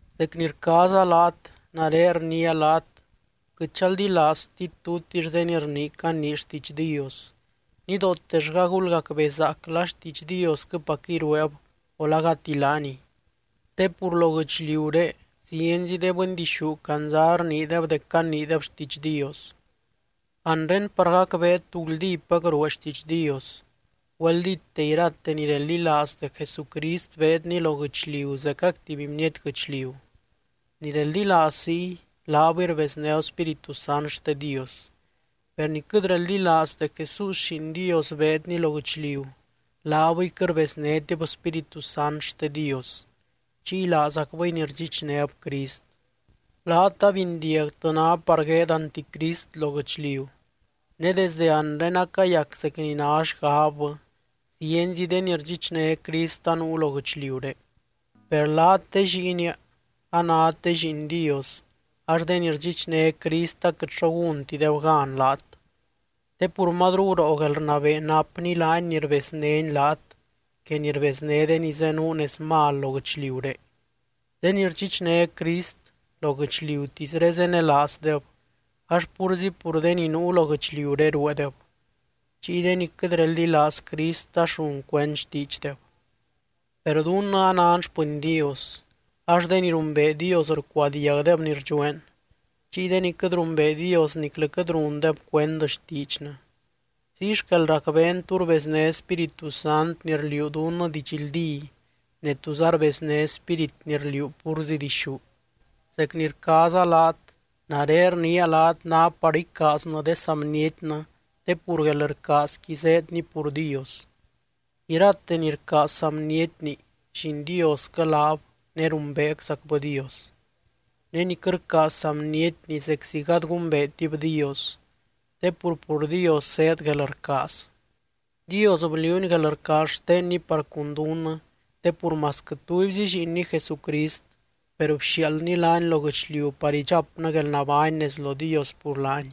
Zec ni rcaaza laat, nare rniia laat quɨt chaldilaaztit tutix de ni rnii canii xtiidx Dios. Nidootellga gulgacbezaac la xtiidx Diosquɨpacquɨy rueeb o la gati laaniy. Te pur lo guɨchliuré zienzi de bɨndixú candza rniideb dec caniideb xtiidx Dios. Anre par gacbeet tú guldípac ruee xtiidx Dios, güeldíte irate ni reldilaaz dec Jesucrist beedny lo guɨchliu zecac tuby bniety guɨchliu. Ni reldilaaz ziy, laabɨy rbeznéb Spíritu Sant xte Dios. Per ni quɨt reldilaaz dec Jesús Lliin Dios beedny lo guɨchliu, laabɨy quɨt rbeznétib Spíritu Sant xte Dios. Chiy laazacbɨy ni rdxichnéb Crist. Laat abindiagtɨ ná par gueed anticrist lo guɨchliu, ne desde anre acayac zec ni ná xgabbɨ, zienzi de ni rdxichné Crist anuu lo guɨchliuré. Per laat, de lliinia, anát de lliin Dios ax de ni rdxichné Crist aquɨt xo gúntideb gan laat, te pur mazru guroo guelrnabee napny laany ni rbeznény laat que ni rbezné de ni zenuu nez mal lo guɨchliuré. De ni rdxichné Crist, lo guɨchliutisré zenelaazdeb ax púrzi pur de ni nuu lo guɨchliuré rueedeb. Chiy de ni quɨt reldilaaz Crist ax run cuend xtiidxdeb. Per dunnɨ anan xpɨny Dios, ax de ni rumbee Dios rcuadiagdeb ni rdxueen. Chiy de ni quɨt rumbee Dios niclɨ quɨt rundeb cuend xtiidxnɨ. Ziy xquel racbeen tú rbezné Spíritu Sant ni rliuu dunnɨ didxldí ne túza rbezné spírit ni rliuu púrzi dixú. Zec ni rcaaza laat, nare rniia laat ná par icaaznɨ de saa bnietnɨ te pur guelrcaazqui zéedny pur Dios. Irate ni rcaaz saa bnietni, lliin Diosquɨ laab ne rumbeeczacbɨ Dios. Ne ni quɨt rcaaz saa bnietni zeczi gady gumbeetib Dios te pur, pur Dios zéed guelrcaaz. Dios bliuuny guelrcaaz xtenny par cun dunnɨ te pur masquɨ tubyzi Lliinny Jesucrist, per bxiaaldny laany lo guɨchliu par idxapnɨ guelnabány nez lo Dios pur laany.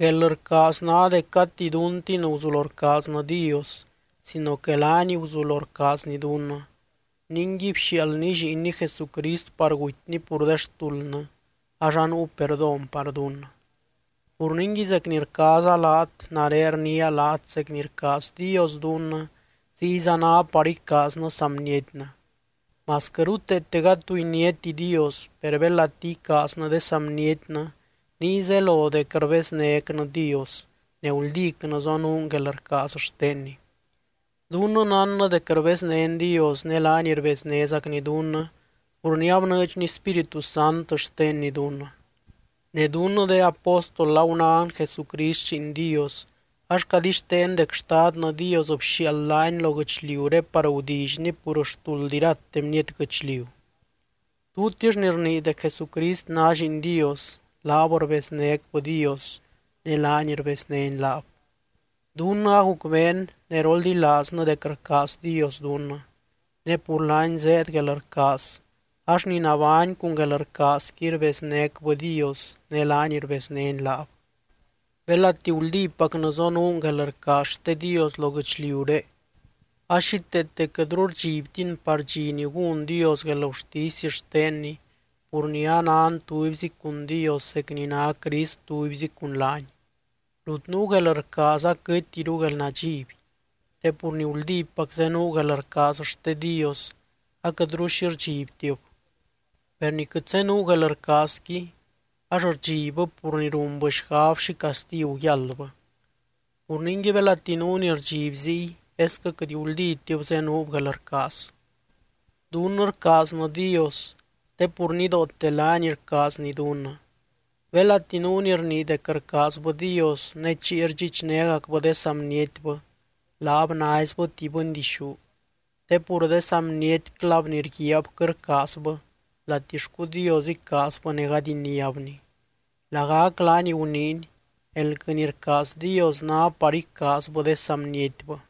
Guelrcaaz ná dec gati duntin guzulo rcaaznɨ Dios sino que laany guzulo rcaazny dunnɨ. Ningui bxiaaldny Lliinny Jesucrist par gutyny pur de xtuldnɨ ax anuu perdón par dunnɨ. Pur ningui zec ni rcaaza laat, nare rniia laat zec ni rcaaz Dios dunnɨ ziyza ná par icaaznɨ saa bnietnɨ. Masquɨ ruteete gady tu iniáti Dios, per belati icaaznɨ de saa bnietnɨ niy zelo dec rbeznécnɨ Dios ne guldícnɨ zonuun guelrcaaz xtenny. Dunnɨ nánnɨ dec rbeznén Dios ne laany rbeznézacny dunnɨ pur ni abnɨɨdxny Spíritu Sant xtenny dunnɨ. Ne dunnɨ de apóstol agunán Jesucrist Lliin Dios, ax cadixteen dec Xtadnɨ Dios bxiaald laany lo guɨchliuré par gudillyny pur xtuld irate bniety guɨchliu. Tutix ni rnii dec Jesucrist ná Lliin Dios, laab rbeznécbɨ Dios ne laany rbeznény laab. Dunnɨ agucbeen ne roldilaaznɨ dec rcaaz Dios dunnɨ, ne pur laany zéed guelrcaaz ax ni nabány cun guelrcaazqui rbeznécbɨ Dios ne laany rbeznény laab. Belati guldípacnɨ zonuun guelrcaaz xte Dios lo guɨchliuré, a xíteete quɨtru rdxibtin par dxi ni gún Dios guelgurtisy xtenny pur ni anan tubyzi cun Dios zec ni ná Crist tubyzi cun laany. Rut nuu guelrcaaz aquɨtiru guelnadxiby. Te pur ni guldípac zenuu guelrcaaz xte Dios, aquɨtru xi rdxibtib. Per ni quɨt zenuu guelrcaazqui ax rdxibbɨ pur ni runbɨ xgab xi castigu yáldbɨ. Pur ningui, belati nuu ni rdxiby ziy, esquɨ quɨt guldítib zenuub guelrcaaz. Dunnɨ rcaaznɨ Dios, te pur nidoote laany rcaazny dunnɨ. Belati nuu ni rnii dec rcaazbɨ Dios ne chiy rdxichnégacbɨ de saa bnietbɨ, laab naizbɨ tuby bɨndixú. Te pur de saa bnietclab ni rguiaab quɨt rcaazbɨ, latixcu Dios icaazbɨ ne gady iniábny. Lagac laany guniiny: Elquɨ ni rcaaz Dios ná par icaazbɨ de saa bnietbɨ.